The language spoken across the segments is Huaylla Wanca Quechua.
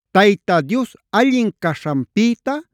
Tayta Dios allin caśhanpïta,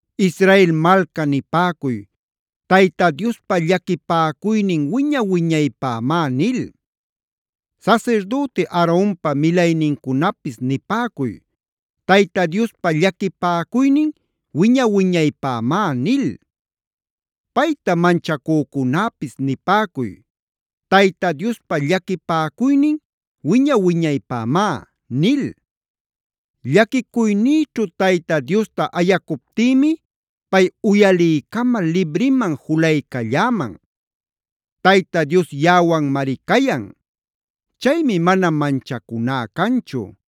Israel malca nipäcuy: “Tayta Diospa llaquipäcuynin wiña-wiñaypämá” nil. Sasirdüti Aaronpa milaynincunapis nipäcuy: “Tayta Diospa llaquipäcuynin wiña-wiñaypämá” nil. Payta manchacücunäpis nipäcuy: “Tayta Diospa llaquipäcuynin wiña-wiñaypämá” nil. Llaquicuynïćhu Tayta Diosta ayacuptïmi pay uyaliycamal libriman julaycalläman. Tayta Dios yaꞌawanmari cayan. Chaymi mana manchacuná canchu;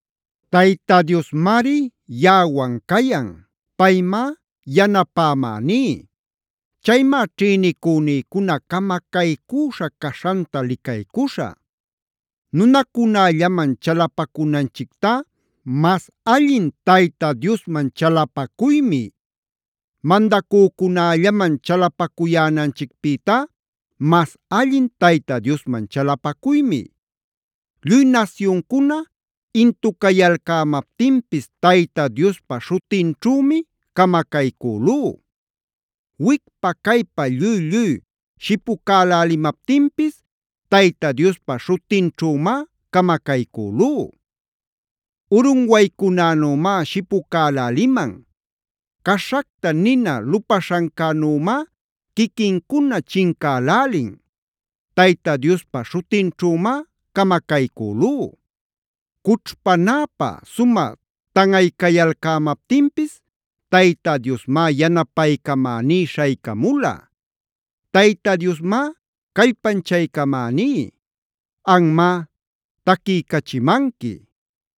Tayta Diosmari yaꞌawan cayan; paymá yanapamäní. Chaymá ćhïnicünïcuna camacaycüśha caśhanta licaycuśhä. Nunacunällaman chalapacunanchictá mas allin Tayta Diosman chalapacuymi. Mandacücunällaman chalapacuyänanchicpïtá mas allin Tayta Diosman chalapacuymi. Lluy nasyuncuna intucayalcämaptinpis, Tayta Diospa śhutinćhümi camacaycülú. Wicpa caypa lluy-lluy shipucälälimaptinpis, Tayta Diospa śhutinćhümá camacaycülú. Urunwaycunänümá shipucäläliman. Caśhacta nina lupaśhancänümá quiquincuna chincälälin. Tayta Diospa śhutinćhümá camacaycülú. Cućhpanäpä sumä tanꞌaycayalcämaptinpis, Tayta Diosmá yanapaycamäní śhaycamula. Tayta Diosmá callpanchaycamäní. Anmá taquiycachimanqui.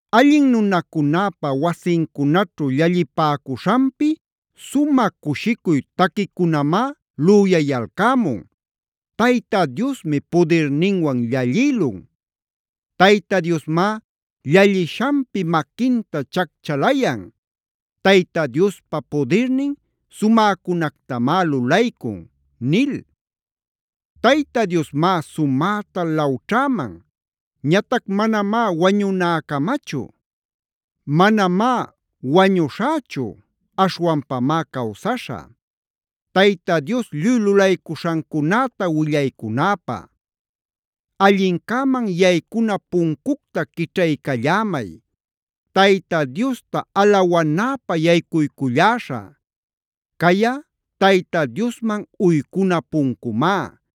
Allin nunacunäpa wasincunaćhu llallipäcuśhanpi, sumä cushicuy taquicunamá lüyayalcämun: “Tayta Diosmi pudirninwan llallïlun. Tayta Diosmá llallishanpi maquinta chacchalayan. Tayta Diospa pudirnin sumäcunactamá lulaycun” nil. Tayta Diosmá sumäta lawćhäman. Ñatac manamá wañunäcamachu. Manamá wañuśhächu, aśhwanpamá cawsaśhä Tayta Dios lluy lulaycuśhancunäta willaycunäpä. Allincäman yaycuna puncucta quićhaycallämay. Tayta Diosta alawanäpä yaycuyculläśhä. Cayꞌa Tayta Diosman yaycuna puncumá.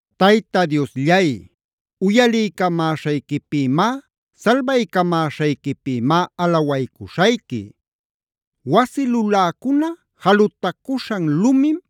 Tayta Diosllay, uyaliycamäśhayquipïmá, salbaycamäśhayquipïmá alawaycuśhayqui. Wasi luläcuna jalutacuśhan lumim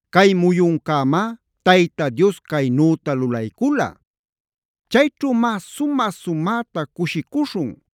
Cay muyuncämá Tayta Dios caynüta lulaycula. Chayćhümá sumä-sumäta cushicuśhun.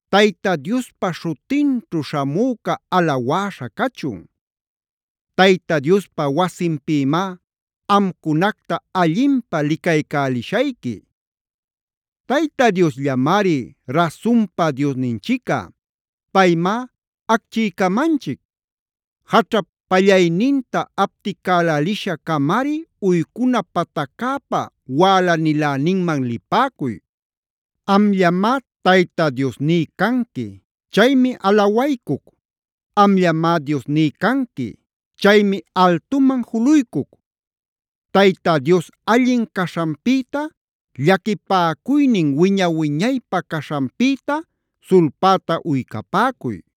¡Tayta Diospa śhutinćhu śhamüca alawäśha cachun!g ¡Tayta Diospa wasinpïmá amcunacta allinpä licaycälishayqui! Tayta Diosllamari rasunpa Diosninchicꞌa; paymá acchiycamanchic. Jaćhap pallayninta apticälälisha-camari uycuna pataccäpa wälaniläninman lipäcuy. Amllamá Tayta Diosní canqui; chaymi alawaycuc. Amllamá Diosní canqui; chaymi altuman juluycuc. Tayta Dios allin caśhanpïta, llaquipäcuynin wiña-wiñaypä caśhanpïta sulpäta uycapäcuy.